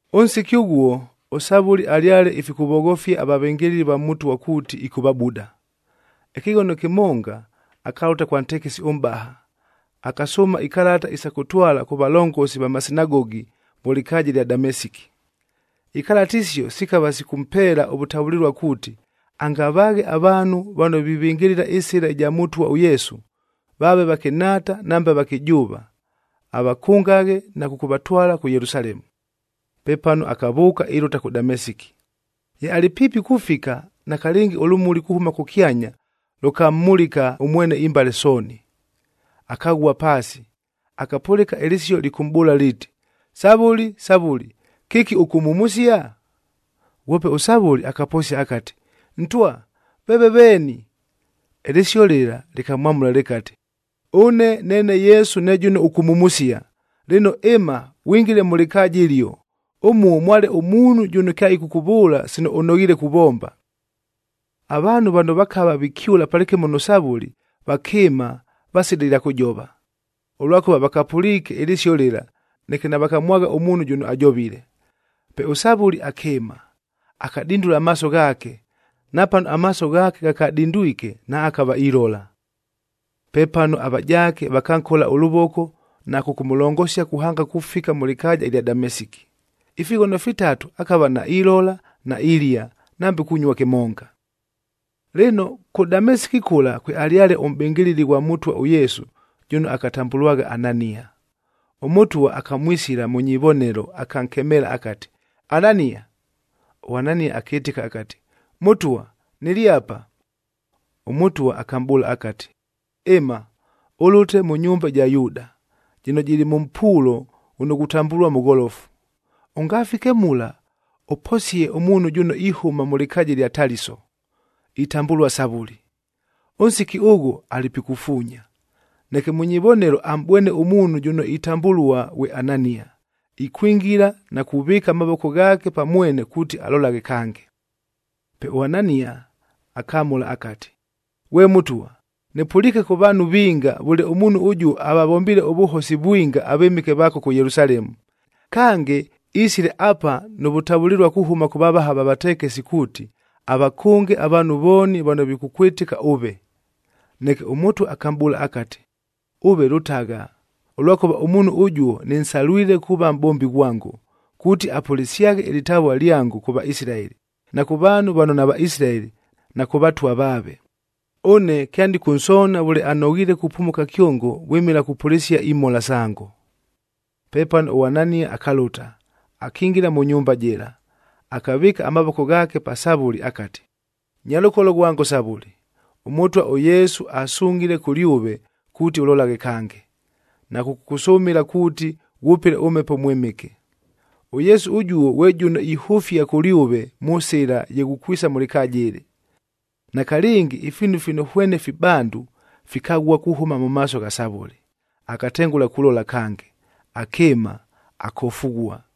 Ʉnsiki ʉghuo, ʉSavʉli alyale ifikʉvoghofia avavɨngɨlɨli va Mʉtwa kuuti ɨkʉvabuda. Ɨkɨghono kɨmonga, akalʉta kwa ntekesi ʉmʼbaha, akasʉʉma ikalata isa kʉtwala kʉ valongosi va masinagogi mʉ lɨkaaja ɨlya Damesiki. Ikalata isio sikava sikʉmpeela ʉvʉtavʉlɨlua kuuti, angavaaghe avaanhu vano vivɨngɨlɨla ɨSɨla ɨja Mʉtwa ʉYesu,a vaave vakɨnhaata nambe avakɨjʉʉva, avakʉngaghe na kʉkʉvatwala kʉ Yelusalemu. Pepano akavʉʉka ilʉta kʉ Damesiki. Ye alɨ piipi kufika, nakalɨngi ʉlʉmuli kuhʉma kʉkyanya lʉkammulika ʉmwene imbale sooni. Akaghua paasi, akapʉlɨka ɨlɨsio lɨkʉmʼbʉʉla liiti, “Savʉli, Savʉli, kɨki ʉkʉmhumusia?” Ghwope ʉSavʉli akaposia akati, “Ntwa, veeve veeni?” Ɨlɨsio lɨla lɨkamwamʉla lɨkati, “Ʉne neene Yesu ne jʉno ʉkʉmhumusia. Lɨno ɨma, ghwingile mʉ lɨkaaja ɨlio. Ʉmuo mwale ʉmuunhu jʉno kyaɨkʉkʉvʉʉla sino ʉnoghiile kuvomba.” Avaanhu vano vakava vikyʉla palɨkɨmo nʉ Savʉli vakɨɨma vasila ɨlya kʉjova, ʉlwakʉva vakapʉliike ɨlɨsio lɨla, neke navakamwagha ʉmuunhu jʉno ajovile. Pe ʉSavʉli akɨɨma, akadindula amaaso ghaake, napano amaaso ghaake ghakadindwike naakava ilola. Pepano avajaake vakankola ʉlʉvoko na kʉkʉmʉlongosia kuhanga kufika mʉ lɨkaaja ɨlya Damesiki. Ifighono fitatu akava nailola, nailia, nambe kunyua kɨmonga. Lɨno, kʉ Damesiki kʉla kwealyale ʉmʼbɨngɨlɨli ghwa Mʉtwa ʉYesu jʉno akatambʉlwagha Anania. ɄMʉtwa akamwisila mʉ nyivonelo akankemeela akati, “Anania!” ɄAnania akɨtɨka akati, “Mʉtwa, nɨlɨ apa.” ɄMʉtwa akamʼbʉʉla akati, “Ɨma, ʉlʉte mʉ nyumba ɨja Yuuda, jɨno jɨlɨ mʉ mpuulo ghʉno ghutambʉlua Mʉgholofu. Ʉngafike mula, ʉposie ʉmuunhu jʉno ihʉma mʉ lɨkaaja ɨlya Taliso, itambʉlua Savʉli. Ʉnsiki ʉghʉ alɨ pikufuunya, neke mʉ nyivonelo amʼbwene ʉmuunhu jʉno itambʉlua ghwe Anania, ikwingila na kuvɨɨka amavoko ghaake pa mwene kuuti alolaghe kange.” Pe ʉAnania akamʉla akati, “Ghwe Mʉtwa, nɨpʉliike kʉ vaanhu vinga vʉle ʉmuunhu ʉjuo avavombiile ʉvʉhosi vwinga avɨmɨke vaako kʉ Yelusalemu. Kange, isile apa nʉ vʉtavʉlɨlua kuhʉma kʉ vavaha va vatekesi kuuti, avakʉnge avaanhu vooni vano vikʉkwɨtɨka ʉve.” Neke ʉMʉtwa akamʼbʉʉla akati, “Ʉve lʉtagha! Ʉlwakʉva ʉmuunhu ʉjuo nɨnsalwile kuuva mʼbombi ghwango, kuuti apʉlɨsyaghe ɨlɨtavua lyango, kʉ Vaisilaeli, na kʉ vaanhu vano naVaisilaeli na kʉ vatwa vaave. Ʉne kyanɨkʉnsoona vʉle anoghiile kupumuka kyongo vwɨmɨla kupʉlɨsia imhola sango.” Pepano ʉAnania akalʉta, akingila mʉ nyumba jɨla, akavɨɨka amavoko ghaake pa Savʉli akati, “Nyalʉkolo ghwango Savʉli, ʉMʉtwa ʉYesu asungʼhile kʉlyʉve kuuti ʉlolaghe kange, na kʉkʉkʉsʉmɨla kuuti ghwʉpɨle ʉMhepo ʉMwɨmɨke. ɄYesu ʉjuo ghwe jʉno ihʉfia kʉlyʉve mʉ sɨla ye ghukwisa mʉ lɨkaaja ɨlɨ.” Nakalɨngi ifiinu fino hwene fibandu fikaghua kuhʉma mʉ maaso gha Savʉli, akatengʉla kulola kange. Akɨɨma, akofughua.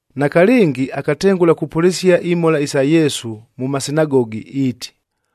Nakalɨngi akatengʉla kupʉlɨsia imhola isa Yesu mʉ masinagogi, iiti,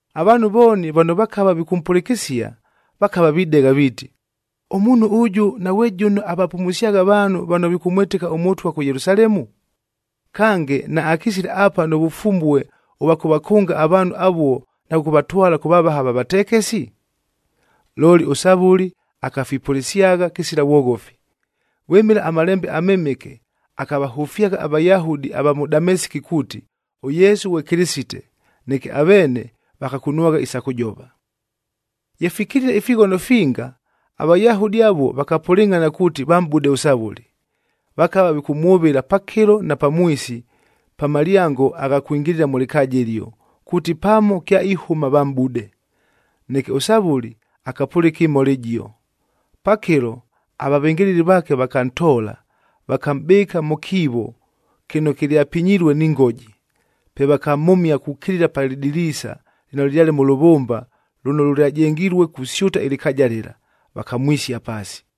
Avaanhu vooni vano vakava vikʉmpʉlɨkɨsia, vakava videgha viiti, “Ʉmuunhu ʉjʉ naghwe jʉno avapumusyagha avaanhu vano vikʉmwɨtɨka ʉMʉtwa kʉ Yelusalemu? Kange, naakisile apa nʉ vʉfumbue ʉvwa kʉvakʉnga avaanhu avuo na kʉkʉvatwala kʉ vavaha va vatekesi?” Looli ʉSavʉli akafipʉlɨsyagha kɨsila vwoghofi. Vwɨmɨla aMalembe aMɨmɨke akavahʉfyagha aVayahudi ava mʉ Damesiki kuuti, ʉYesu ghwe Kɨlɨsite, neke aveene vakakunwagha isa kʉjova. Ye fikilile ifighono finga, aVayahudi avuo vakapʉlɨngʼhana kuuti vamʼbude ʉSavʉli. Vakava vikʉmwʉvɨla pakɨlo na pamwisi pa malyango agha kwingilila mʉ lɨkaaja ɨlio, kuuti pano kyaihʉma vamʼbude. Neke ʉSavʉli akapʉlɨka ɨmhola ɨjio. Pakɨlo, avavɨngɨlɨli vaake vakantoola, vakamʼbɨɨka mʉ kiivo kɨno kɨlyapinyilue ni ngoji. Pe vakamhʉmia kukilila pa lɨdiliisa lɨno lɨlyale mʉ lʉvʉmba lʉno lʉlyajengilue kusyʉta ɨlɨkaaja lɨla, vakamwisia paasi.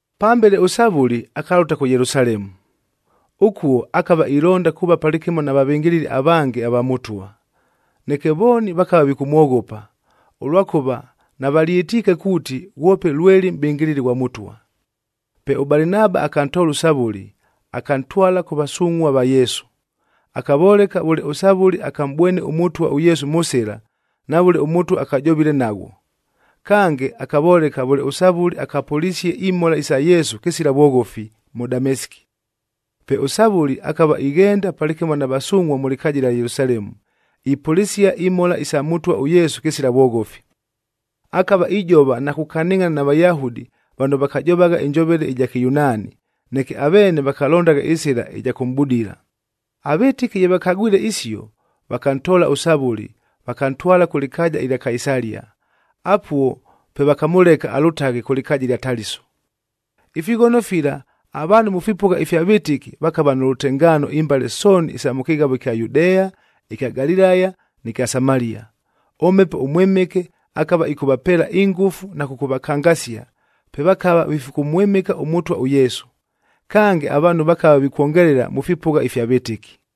Pambele ʉSavʉli akalʉta kʉ Yelusalemu. Ʉkuo akava ilonda kuuva palɨkɨmo na vavɨngɨlɨli avange ava Mʉtwa, neke vooni vakava vikʉmwoghopa, ʉlwakʉva navalyɨtiike kuuti, ghwope lweli mʼbɨngɨlɨli ghwa Mʉtwa. Pe ʉBalinaba akantoola ʉSavʉli, akantwala kʉ vasungʼhua va Yesu. Akavoleka vʉle ʉSavʉli akamʼbwene ʉMʉtwa ʉYesu mʉ sɨla, na vʉle ʉMʉtwa akajovile naghwo. Kange, akavoleka vʉle ʉSavʉli akapʉlisie imhola isa Yesu kɨsila vwoghofi, mʉ Damesiki. Pe ʉSavʉli akava ighenda palɨkɨmo na vasungʼhua mʉ lɨkaaja ɨlya Yelusalemu, ipʉlɨsia imhola isa Mʉtwa ʉYesu kɨsila vwoghofi. Akava ijova na kukanɨngʼhana na Vayahudi vano vakajovagha ɨnjovele ɨja Kɨyunaani, neke aveene vakalondagha ɨsɨla ɨja kʉmʼbudila. Avɨtɨki ye vakagwile isio, vakantoola ʉSavʉli, vakantwala kʉ lɨkaaja ɨlya Kaisalia, apuo pe vakamʉleka alʉtaghe kʉ lɨkaaja ɨlya Taliso. Ifighono fila, avaanhu mʉ fipʉgha ifya vɨtɨki vakava nʉ lʉtengaano imbale sooni isa mʉ kɨghavo ɨkya Yudea, ɨkya Galilaya nɨ kya Samalia. ɄMhepo ʉMwɨmɨke akava ɨkʉvapeela ingʉfu na kʉkʉvakangasia, pe vakava vifikʉmwɨmɨka ʉMʉtwa ʉYesu. Kange, avaanhu vakava vikwongelela mʉ fipʉgha ifya vɨtɨki.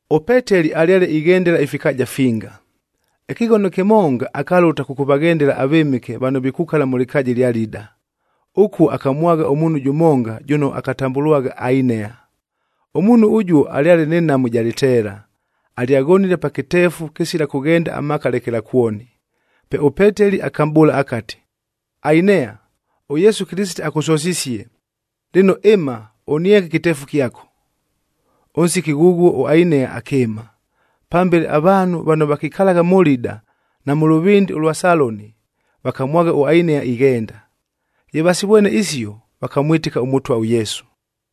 ɄPeteli alyale ighendela ifikaaja finga. Ɨkɨghono kɨmonga, akalʉta kʉkʉvaghendela avɨmɨke vano vikukala mʉ lɨkaaja ɨlya Lida. Ʉkuo akamwagha ʉmuunhu jʉmonga jʉno akatambʉlwagha Ainea. Ʉmuunhu ʉjuo alyale nɨ nhamu ɨja lɨteela, alyaghonile pa kɨteefu kɨsila kʉghenda amaaka lekelakwoni. Pe ʉPeteli akamʼbʉʉla akati, “Ainea, ʉYesu Kɨlɨsite akʉsosisie! Lɨno ɨma, ʉnienge ɨkɨteefu kyako.” Ʉnsiki ghʉghuo ʉAinea akɨɨma. Pambele avaanhu vano vakikalagha mʉ Lida na mʉ lʉvɨndɨ ʉlwa Saloni vakamwagha ʉAinea ighenda. Ye vasivwene isio, vakamwɨtɨka ʉMʉtwa ʉYesu.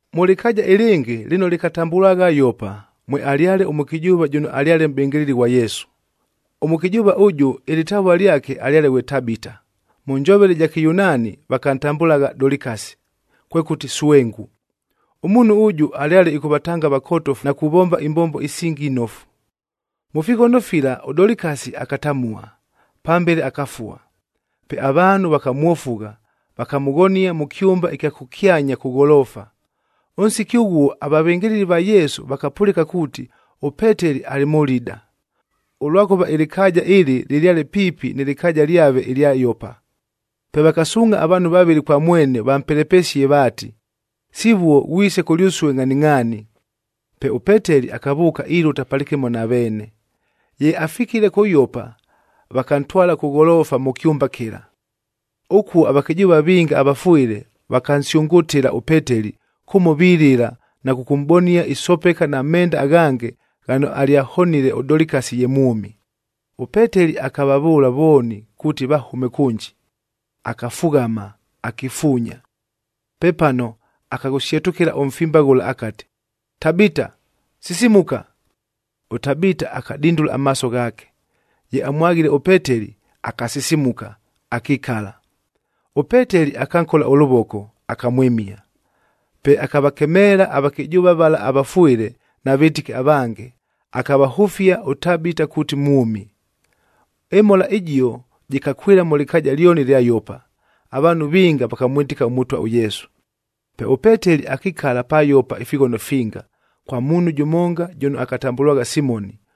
Mʉ lɨkaaja ɨlɨngɨ lɨno lɨkatambʉlwagha Yopa, mwealyale ʉmʉkɨjʉʉva jʉno alyale mʼbɨngɨlɨli ghwa Yesu. Ʉmʉkɨjʉʉva ʉjʉ ɨlɨtavua lyake alyale ghwe Tabita, mʉ njovele ɨja Kɨyunaani vakantambʉlagha Dolikasi, kwekʉti swengu. Ʉmuunhu ʉjʉ alyale ɨkʉvatanga avakotofu na kuvomba imbombo isingi inofu. Mʉ fighono fila ʉDolikasi akatamua, pambele akafua. Pe avaanhu vakamwofugha, vakamʉghonia mʉ kyʉmba ɨkya kʉkyanya kʉ gholoofa. Ʉnsiki ʉghuo avavɨngɨlɨli va Yesu vakapʉlɨka kuuti ʉPeteli alɨ mʉ Lida, ʉlwakʉva ɨlɨkaaja ɨlɨ lɨlyale piipi nɨ lɨkaaja lyave ɨlya Yopa. Pe vakasuungʼha avaanhu vavɨlɨ kwa mwene vampelepesie vaati, “Sivuo ghwise kʉlyʉsue ngʼhaningʼhaani!” Pe ʉPeteli akavʉʉka ilʉta palɨkɨmo na veene. Ye afikile kʉ Yopa, vakantwala kʉ gholoofa mʉ kyʉmba kɨla. Ʉkuo avakɨjʉʉva vinga avafwɨle vakansyʉngʉtɨla ʉPeteli kʉmo vilɨla na kʉkʉmʼbonia isopeka na menda aghange ghano alyahonile ʉDolikasi ye mwʉmi. ɄPeteli akavavʉʉla vooni kuuti vahʉme kʉnji, akafughama, akifuunya. Pepano akaghʉsyetʉkɨla ʉmfimba ghʉla akati, “Tabita, sisimuka!” ɄTabita akadindula amaaso ghaake. Ye amwaghile ʉPeteli, akasisimuka, akikala. ɄPeteli akankola ʉlʉvoko, akamwɨmia. Pe akavakemeela avakɨjʉʉva vala avafwɨle na vɨtɨki avange, akavahʉfia ʉTabita kuuti mwʉmi. Ɨmhola ɨjio jɨkakwɨla mʉ lɨkaaja lyoni ɨlya Yopa, avaanhu vinga vakamwɨtɨka ʉMʉtwa ʉYesu. Pe ʉPeteli akikala pa Yopa ifighono finga, kwa muunhu jʉmonga jʉno akatambʉlwagha Simoni.